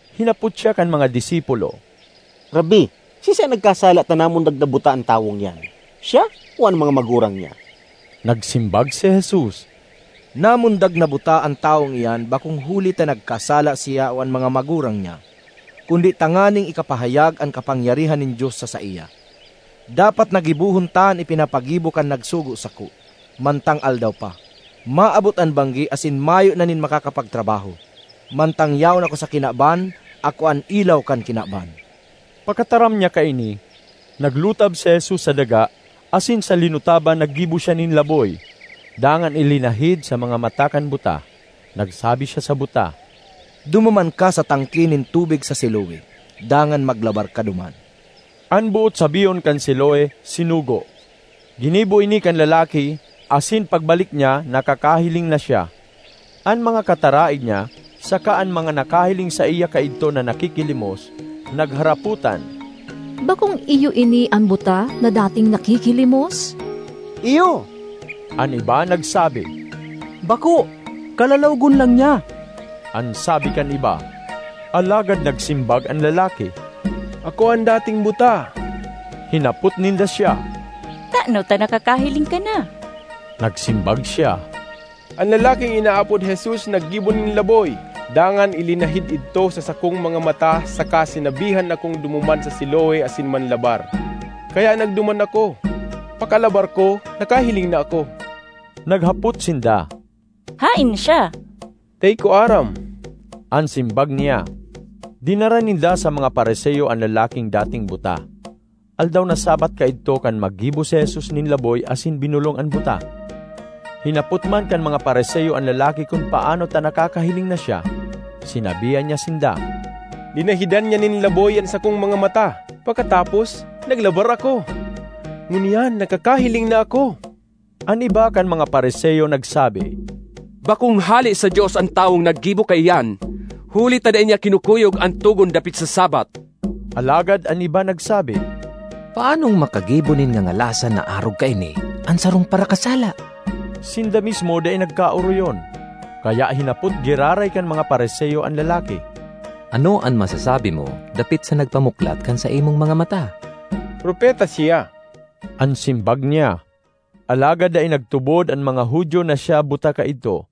Hinapot siya kan mga disipulo, “Rabbi, siisay an nagkasala ta namundag na buta an tawong iyan, siya o an mga magurang niya?” Nagsimbag si Jesus, “Namundag na buta an tawong iyan bakong huli ta nagkasala siya o an mga magurang niya, kundi tanganing ikapahayag an kapangyarihan nin Dios sa saiya. Dapat na gibohon ta an ipinapagibo kan nagsugo sako, mantang aldaw pa; maabot an banggi asin mayo na nin makakapagtrabaho. Mantang yaon ako sa kinaban, ako an ilaw kan kinaban.” Pakataram niya kaini, naglutab si Jesus sa daga, asin sa linutaban naggibo siya nin laboy; dangan ilinahid sa mga mata kan buta. Nagsabi siya sa buta, “Dumuman ka sa tangke nin tubig sa Siloe, dangan maglabar ka duman.” (An boot sabihon kan Siloe, “Sinugo.”) Ginibo ini kan lalaki, asin pagbalik niya nakakahiling na siya. An mga kataraed niya saka an mga nakahiling saiya kaidto na nakikilimos nagharapotan, “Bakong iyo ini an buta na dating nakikilimos?” ”Iyo.” An iba nagsabi, “Bako! Kalalawogon lang niya,” an sabi kan iba. Alagad nagsimbag an lalaki, “Ako an dating buta.” Hinapot ninda siya, “Tano ta nakakahiling ka na?” Nagsimbag siya, “An lalaking inaapod Jesus naggibo nin laboy, dangan ilinahid idto sa sakong mga mata saka sinabihan akong dumuman sa Siloe asin manlabar. Kaya nagduman ako; pakalabar ko nakahiling na ako.” Naghapot sinda, “Haen siya?” “Dai ko aram,” an simbag niya. Dinara ninda sa mga Fariseo an lalaking dating buta. Aldaw na Sabbath kaidto kan maggibo si Jesus nin laboy asin binolong an buta. Hinapot man kan mga Fariseo an lalaki kun paano ta nakakahiling na siya. Sinabihan niya sinda, “Linahidan niya nin laboy an sakong mga mata. Pakatapos, naglabar ako. Ngunyan nakakahiling na ako.” An iba kan mga Fariseo nagsabi, “Bakong hale sa Dios an tawong naggibo kaiyan huli ta dai niya kinukuyog an togon dapit sa Sabbath.” Alagad an iba nagsabi, “Paanong makagibo nin ngangalasan na arog kaini an sarong parakasala?” Sinda mismo dai nagkaoroyon. Kaya hinapot giraray kan mga Fariseo an lalaki, “Ano an masasabi mo dapit sa nagpamuklat kan saimong mga mata?” “Propeta siya,” an simbag niya. Alagad dai nagtubod an mga Judio na siya buta kaidto,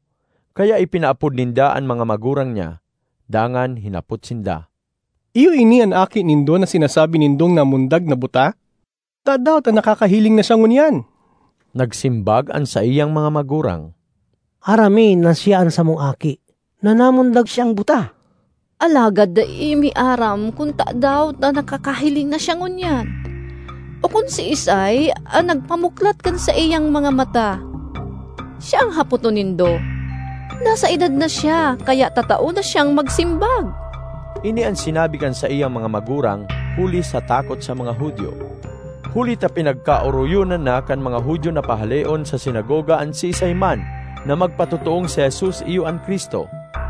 kaya ipinaapod ninda an mga magurang niya. Dangan hinapot sinda, “Iyo ini an aki nindo na sinasabi nindong namundag na buta? Tadaw ta nakakahiling na siya ngunyan?” Nagsimbag an saiyang mga magurang, “Aram mi na siya an samong aki, na namundag siyang buta. Alagad dai mi aram kun tadaw ta nakakahiling na siya ngunyan, o kun siisay an nagpamuklat kan saiyang mga mata. Siya an hapoton nindo. Nasa edad na siya kaya tatao na siyang magsimbag!” Ini an sinabi kan saiyang mga magurang huli sa takot sa mga Judio; huli ta pinagkaoroyonan na kan mga Judio na pahaleon sa sinagoga an siisay man na magpatotoong si Jesus iyo an Cristo.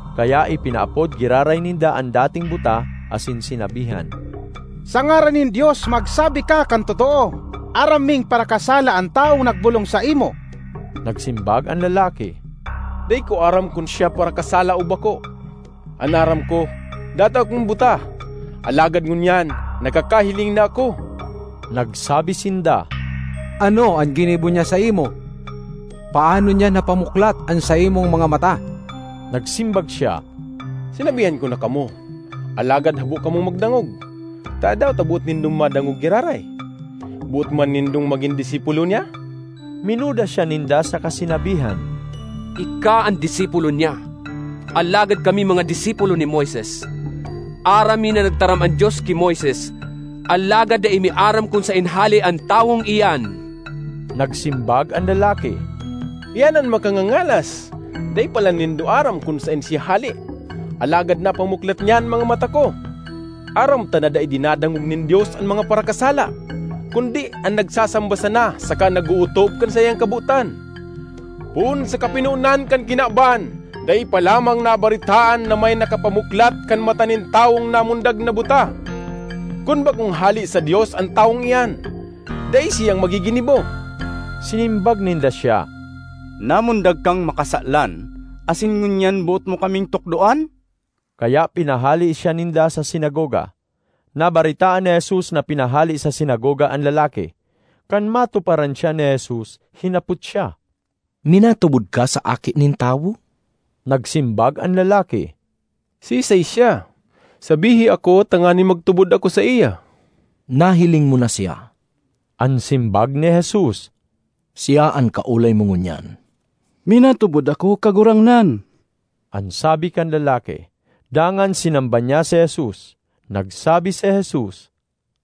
Kaya ipinaapod giraray ninda an dating buta asin sinabihan, “Sa ngaran nin Dios magsabi ka kan totoo! Aram ming parakasala an tawong nagbolong saimo.” Nagsimbag an lalaki, “Dai ko aram kun siya parakasala o bako. An aram ko, dati akong buta, alagad ngunyan nakakahiling na ako.” Nagsabi sinda, “Ano an ginibo niya saimo? Paano niya napamuklat an saimong mga mata?” Nagsimbag siya, “Sinabihan ko na kamo, alagad habo kamong magdangog. Tadaw ta boot nindong madangog giraray? Boot man nindong magin disipulo niya?” Minuda siya ninda saka sinabihan, “Ika an disipulo niya; alagad kami mga disipulo ni Moises. Aram mi na nagtaram an Dios ki Moises; alagad dai mi aram kun saen hale an tawong iyan!” Nagsimbag an lalaki, “Iyan an makangangalas! Dai palan nindo aram kun saen siya hale alagad napamuklat niya an mga mata ko! Aram ta na dai dinadangog nin Dios an mga parakasala, kundi an nagsasamba sana saka nag-ootob kan saiyang kabotan. Poon sa kapinonan kan kinaban dai pa lamang nabaretaan na may nakapamuklat kan mata nin tawong namundag na buta. Kun bakong hale sa Dios an tawong iyan, dai siyang maggiginibo.” Sinimbag ninda siya, “Namundag kang makasalan, asin ngunyan boot mo kaming tukdoan?” Kaya pinahale siya ninda sa sinagoga. Nabaretaan ni Jesus na pinahale sa sinagoga an lalaki. Kan matuparan siya ni Jesus, hinapot siya, “Minatubod ka sa Aki nin Tawo?” Nagsimbag an lalaki, “Siisay siya? Sabihi ako, tanganing magtubod ako saiya!” ”Nahiling mo na siya,” an simbag ni Jesus, “siya an kaolay mo ngunyan.” ”Minatubod ako, Kagurangnan!” an sabi kan lalaki. Dangan sinamba niya si Jesus. Nagsabi si Jesus,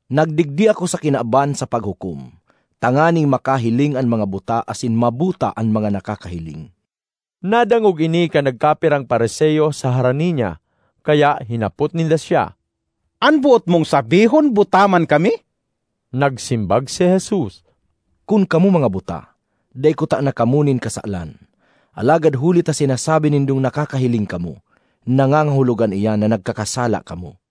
“Nagdigdi ako sa kinaban sa paghukom, tanganing makahiling an mga buta asin mabuta an mga nakakahiling.” Nadangog ini kan nagkapirang Fariseo sa harani niya, kaya hinapot ninda siya, “An boot mong sabihon buta man kami?” Nagsimbag si Jesus, “Kun kamo mga buta, dai kutana kamo nin kasalan. Alagad huli ta sinasabi nindong nakakahiling kamo, nangangahulugan iyan na nagkakasala kamo.”